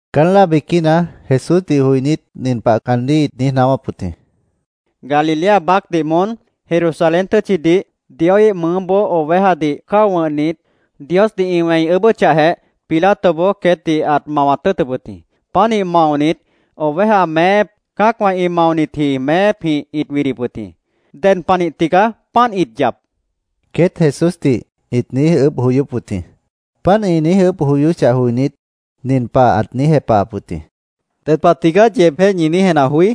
Caán láa biquína Jesúsdih joinít nin pah caandíh ĩt niíj naáwáp wʉt jĩ: —Galilea baácdih moón Jerusalén tʉ́tchidih Dioíh mʉʉ́boó ovejadih cáo wʉ̃hnit, Diosdih ĩ wẽi ʉʉ́bʉ́chahjeh, Pilatoboó queétdih ãt mawat tʉ́ʉtʉp wʉt jĩ. Pánih maonit, oveja meép, cã́acwã ĩ maonitji meépjĩh ĩt widip wʉt jĩ. ¿Ded panih tigaá páant ĩt yap? queét Jesúsdih ĩt niíj ʉʉ́bh joyóp wʉt jĩ. Páant ĩ niíj ʉʉ́bh joyóchah joinít, nin pah ãt niíj jepahap wʉt jĩ: —¿Ded pah tigaá yeebjéh ñi niíj jenah joí?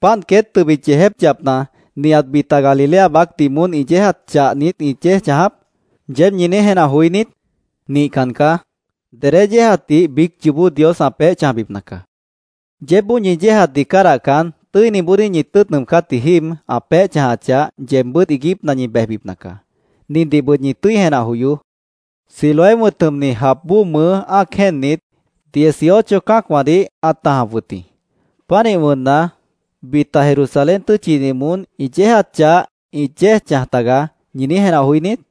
‘Páant queét tʉbit yeejép yapna, nihat bita Galilea baácdih moón ĩ yéejat chah niít ĩt yéej chãjap’, ¿yeéb ñi niíj jenah joí niít? Nihcan caá. Dedé yéejatdih biíc yoobó Dios ã peéh chãjbipna caá. Yeébboó ñi yéejatdih cádahcan, tʉ́iniboodíh ñi tʉ́ʉt nʉʉmcátji jíib ã peéh chãjachah, yeebbʉ́t iiguípna ñi bejbipna caá. Nindihbʉt ñi tʉ́i jenah joyoó: Siloé wʉ̃t jʉmni jap bóo mʉʉ́ ã́ac jéennit, dieciocho cã́acwãdih ãt tãjap wʉt jĩ. ‘Pánih wʉnna, bita Jerusalén tʉ́tchidih moón ĩ yéejat chah ĩt yéej chãj tagaá’, ¿ñi niíj jenah joí niít?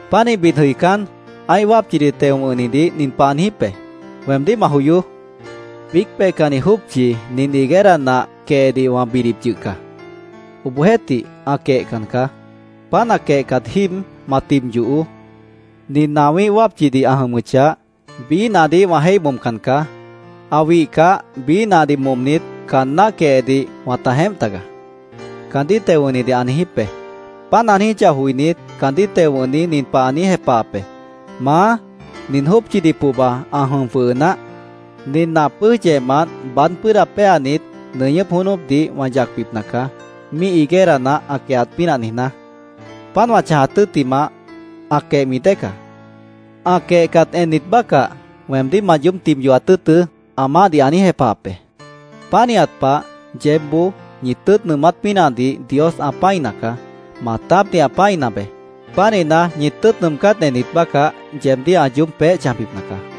Pánih bid jʉicán, ã́ih wápchidih teo wʉ̃hnidih nin pah ã niijíp be: ‘Weemdíh ma joyoó. Biíc peihcanni jópchi nin higuera nah quehedih wã bidip yʉh caá. Obohjeéhtih, ã quehcan caá. Páant ã quehcat jíib ma tib yohoó. Nin nah wĩ́ih wápchidih ã jʉmʉchah, biíh nahdih wã jéih momcan caá. Ã wihcah, biíh nahdih momnit, caan náh quehedih wãta jeémp tagaá’, caandíh teo wʉ̃hnidih ã niijíp be. Páant ã niijíchah joinít, caandíh teo wʉ̃hni nin pah ã niíj jepahap be: ‘Maá, nin jópchidih pohba ã jʉm jwʉhʉ naáh. Nin nah pʉ́ʉj yehmant baád pʉ́ʉda péanit, nʉñʉ́p jónópdih wã yacbipna caá, míih higuera nah ã quehat pínah niijná. Páant wã chãjat tʉ́ttimah, ã quehmi dée caá. Ã quehcat ennit bácah, weemdíh ma yoób tib yohat tʉ́ʉtʉ́’, ã maáhdih ã niíj jepahap be. Pánihat pah, yeébboó ñi tʉ́ʉt nʉʉmát pínahdih Dios ã pã́ina caá. Maatápdih ã pã́ina beé. Pánihna, ñi tʉ́ʉt nʉʉmcát ennit bácah, yeebdíh ã yoób peéh chãjbipna caá”, Jesús ãt niijíp wʉt jĩ.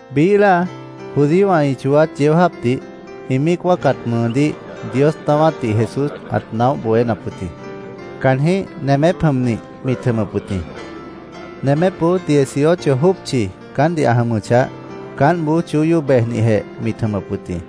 Biíh láa judíowã ĩ chooát yeó jáapdih ĩ míic wáacat mʉʉdíh Dios naáwátdih Jesús ãt naóh bohénap wʉt jĩ. Caanjĩ́h nemép jʉmnih mit jʉmʉp wʉt jĩ. Nemépboó dieciocho jópchi caántdih ã jʉmʉchah, caántboó chóyó bejnihjeh mit jʉmʉp wʉt jĩ.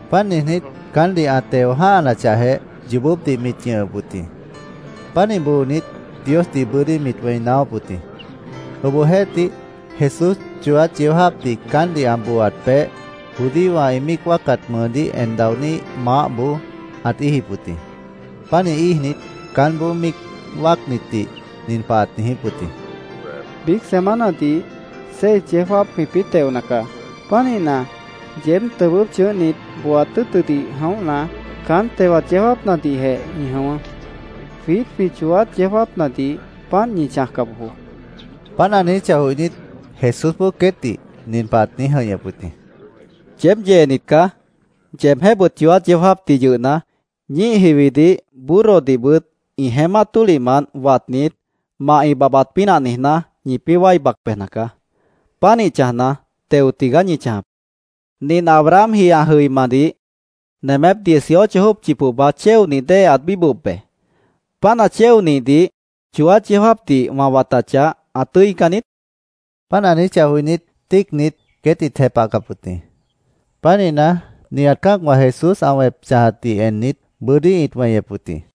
Páant niijnít, caántdih ã teo jã́hanachahjeh, yoobópdih mit ñʉhʉp wʉt jĩ. Pánih boonit, Diosdih bʉ́dí mit wẽi naáwáp wʉt jĩ. Obohjeéhtih, Jesús chooát yeó jáapdih caántdih ã booaat peéh, judíowã ĩ míic wáacat mʉʉdíh en daoní maáhboó ãt íijip wʉt jĩ. Pánih íijnit, caánboó míic wáacnitdih nin pah ãt niijíp wʉt jĩ: —Biíc semanadih seis yeó jáap jwĩpĩ́ teona caá. Pánihna, yeéb tʉbʉ́p chʉ̃ʉ́hnit booat tʉ́ʉtʉdih jʉ̃óhna, caán tewat yeó jáapnadihjeh ñi jʉ̃ʉ́wʉ́. Jwiít jwĩ chooát yeó jáapnadih páant ñi chãjca bojoó, ãt niijíp wʉt jĩ. Páant ã niijíchah joinít, Jesúsboó queétdih nin pah ãt niíj jʉ̃ihñʉp wʉt jĩ: —Yeéb yeenit caá. Yeebjéhbʉt chooát yeó jáapdih yʉhna, ñíih jiwidih, burrodihbʉt ĩ jeémát tólihmant watnit, mah ĩ babhbat pínah niijná, ñipĩ́ wái bac bejna caá. Pánih chãjna, teo tigaá ñi chãjap. ¿Nint Abrahamji ã jʉimadih nemép dieciocho jópchi pohba chéonih dée ãt bíbohop be. Páant ã chéonihdih chooát yeó jáapdih wã watachah, ã tʉ́ican niít? ãt niijíp wʉt jĩ. Páant ã niijíchah joinít, tíicnit, queét ĩt jepahcap wʉt jĩ. Pánihna, nihat cã́acwã Jesús ã wẽp chãjatdih ennit, bʉ́dí ĩt weñep wʉt jĩ.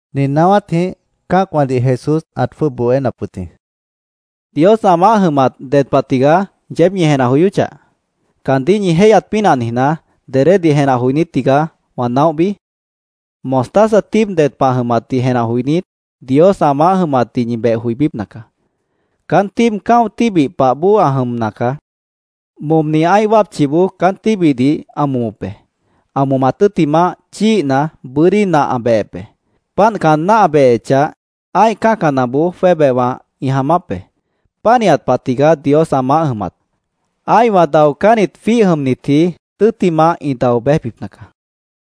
Nin naáwátjĩh cã́acwãdih Jesús ãt jwʉ́ʉb bohénap wʉt jĩ: “¿Dios ã maáh jʉmat ded pahna tigaá, yeéb ñi jenah joyóchah? ¿Caandíh ñi jéihyat pínah niijná, dedédih jenah joinít tigaá, wã naóhbi? Mostaza tíib ded pah ã jʉmatdih jenah joinít, Dios ã maáh jʉmatdih ñi beh joibípna caá. Caán tíib cã́o tíbih pah bóo ã jʉmna caá. Momni ã́ih wápchiboó caán tíbihdih ã momop be. Ã momat tʉ́ttimah, chíihna, bʉ́dí nah ã behep be. Páant caan náh ã behechah, ã́ih cã́canaboó jwébehwã ĩ jaamáp be. Pánihat pah tigaá Dios ã maáh jʉmat. Ã́ihwã daocánnit jwíih jʉmnitji, tʉ́ttimah ĩ dao béjbipna caá”, Jesús ãt niijíp wʉt jĩ.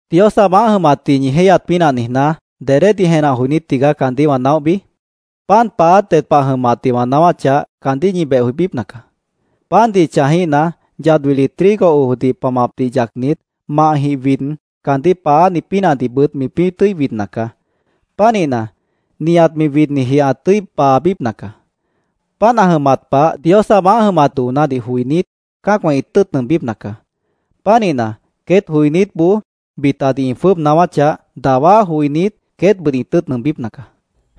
“¿Dios ã maáh jʉmatdih ñi jéihyat pínah niijná, dedédih jenah joinít tigaá caandíh wã naóhbi? Pan paáát ded pah ã jʉmatdih wã naáwáchah, caandíh ñi beh joibípna caá. Pandih chãjíhna, yad wili trigo ojdih pamapdih yacnit, mahjĩh wid, caandíh paááni pínahdihbʉt mipĩ́ tʉ́i widna caá. Pánihna, nihat mi widniji ã tʉ́i paabípna caá. Páant ã jʉmat pah Dios ã maáh jʉmat doonádih joinít, cã́acwã ĩ tʉ́ʉt nʉʉmbípna caá. Pánihna, queét joinítboó bitadih ĩ jwʉ́ʉb naáwáchah, dawá joinít, queétbʉt ĩ tʉ́ʉt nʉʉmbípna caá”,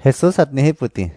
Jesús ãt niijíp wʉt jĩ.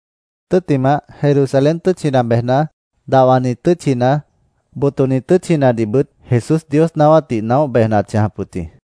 Tʉ́ttimah, Jerusalén tʉ́tchina bejna, dahwani tʉ́tchina, botoni tʉ́tchinadihbʉt Jesús Dios naáwátdih naóh bejna ãt chãjap wʉt jĩ.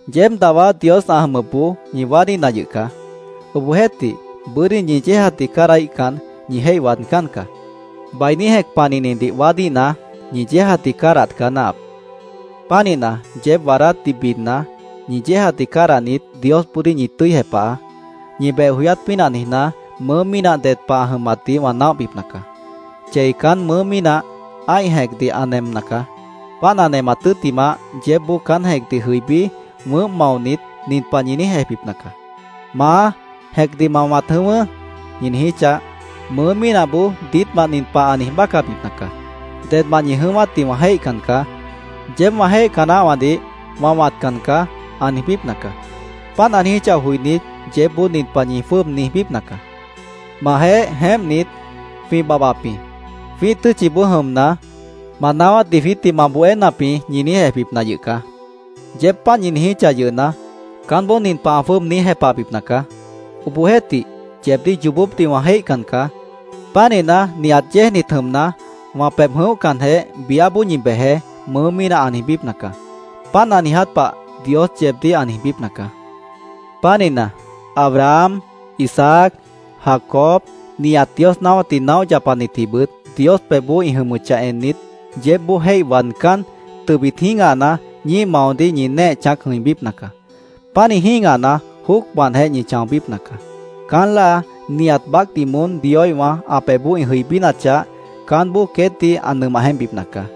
—Yeéb dawá Dios ã jʉmʉpboó ñi waádíhna yʉh caá. Obohjeéhtih, bʉ́dí ñi yéejatdih cádahíhcan, ñi jéih waadcán caá. Bainí jẽc panihnidih waádíhna, ñi yéejatdih cádahat caá náahap. Pánihna, yeéb waadátdih bidna, ñi yéejatdih cádahnit, Diosboodíh ñi tʉ́i jepahaá. Ñi beh joyát pínah niijná, mʉʉ́ mínah ded pah ã jʉmatdih wã naóhbipna caá. Chei caán mʉʉ́ mínah ã́ih jẽcdih ã nemna caá. Páant ã nemat tʉ́ttimah, yeébboó caán jẽcdih jʉibí, wʉʉ́mp maonit, nin pah ñi niíj ejbipna caá, ‘Maá, jẽcdih ma wãt jʉ̃ʉ́wʉ́’, ñi niijíchah, mʉʉ́ mínahboó diítmant nin pah ã niij bácabipna caá. ‘Dedmant ñi jʉ̃ʉ́wátdih wã jéihcan caá. Yeéb wã jéihca naáhwãdih wã wãtcan caá’, ã niijbípna caá. Páant ã niijíchah joinít, yeébboó nin pah ñi jwʉ́ʉb niijbípna caá, ‘Majeéh jeémpnit, jwĩ babhbap jĩ. Jwĩ́ih tʉ́tchiboó jʉmna, ma naáwátdih jwiítdih ma bohénap jĩ’, ñi niíj ejbipna yʉh caá. Yeéb páant ñi niijíchah yʉhna, caánboó nin pah ã jwʉ́ʉb niíj jepahbipna caá, ‘Obohjeéhtih, yeebdíh yoobópdih wã jéihcan caá. Pánihna, nihat yéejnit jʉmna, wã pebh jʉ̃óhcanjeh, biáboó ñi bejeé’, mʉʉ́ mínah ã niijbípna caá. Páant ã niiját pah Dios yeebdíh ã niijbípna caá. Pánihna, Abraham, Isaac, Jacob, nihat Dios naáwátdih naóh yapanitjibʉt, Dios pebhboó ĩ jʉmʉchah ennit, yeébboó jéih waadcán, tʉbit jĩ́gahna, ñíih maodíh ñi néeh chãác jʉ̃ibípna caá. Pánih jĩ́gahna, jóocmantjeh ñi chãobípna caá. Caán láa nihat baácdih moón Dioíhwã ã pebhboó ĩ jʉibínachah, caánboó queétdih ã nʉmah jeémpbipna caá.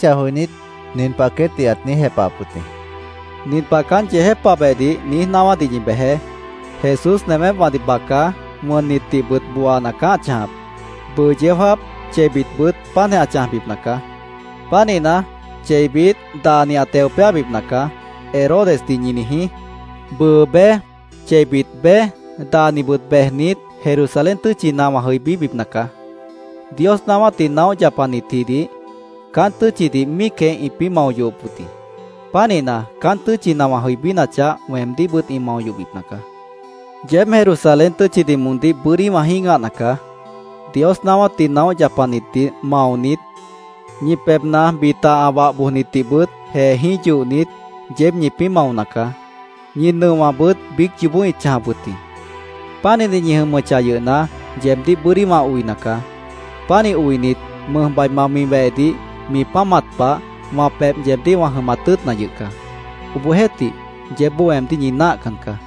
Páant ĩ niijíchah joinít, nin pah queétdih ãt niíj jepahap wʉt jĩ: —Nin pah caán yeejépabehdih niíj naáwádih ñi bejeé: ‘Jesús nemépwãdih baca, wʉnnitdihbʉt booana caá ã chãjap. Bʉʉ yeó jáap, cheibitbʉt páant ã chãjbipna caá. Pánihna, cheibit daani ã teo péabipna caá’, Herodesdih ñi niijí. Bʉʉ bej, cheibit bej, daanibʉt bejnit, Jerusalén tʉ́tchina wã jʉibíbipna caá. Dios naáwátdih naóh yapanitjidih caán tʉ́tchidih míicjeh ĩpĩ́ mao yohop wʉt jĩ. Pánihna, caán tʉ́tchina wã jʉibínachah, weemdíhbʉt ĩ mao yohbipna caá. “Yeéb Jerusalén tʉ́tchidih moondíh bʉ́dí wã jĩ́gahna caá. Dios naáwátdih naóh yapanitdih maonit, ñi pebhna bita ã wah bojnitdihbʉt jeejĩ́h yohnit, yeéb ñipĩ́ maona caá. Ñi nʉowãbʉt biíc yoobó ĩt chãjap wʉt jĩ. Pánihnit ñi jʉmʉchah yʉhna, yeebdíh bʉ́dí wã oina caá. Pánih oinit, mʉjbaima mi wehdih mi páamat pah, wã pebh yeebdíh wã jʉmat tʉ́ʉtna yʉh caá. Obohjeéhtih, yeébboó weemdíh ñi náahcan caá.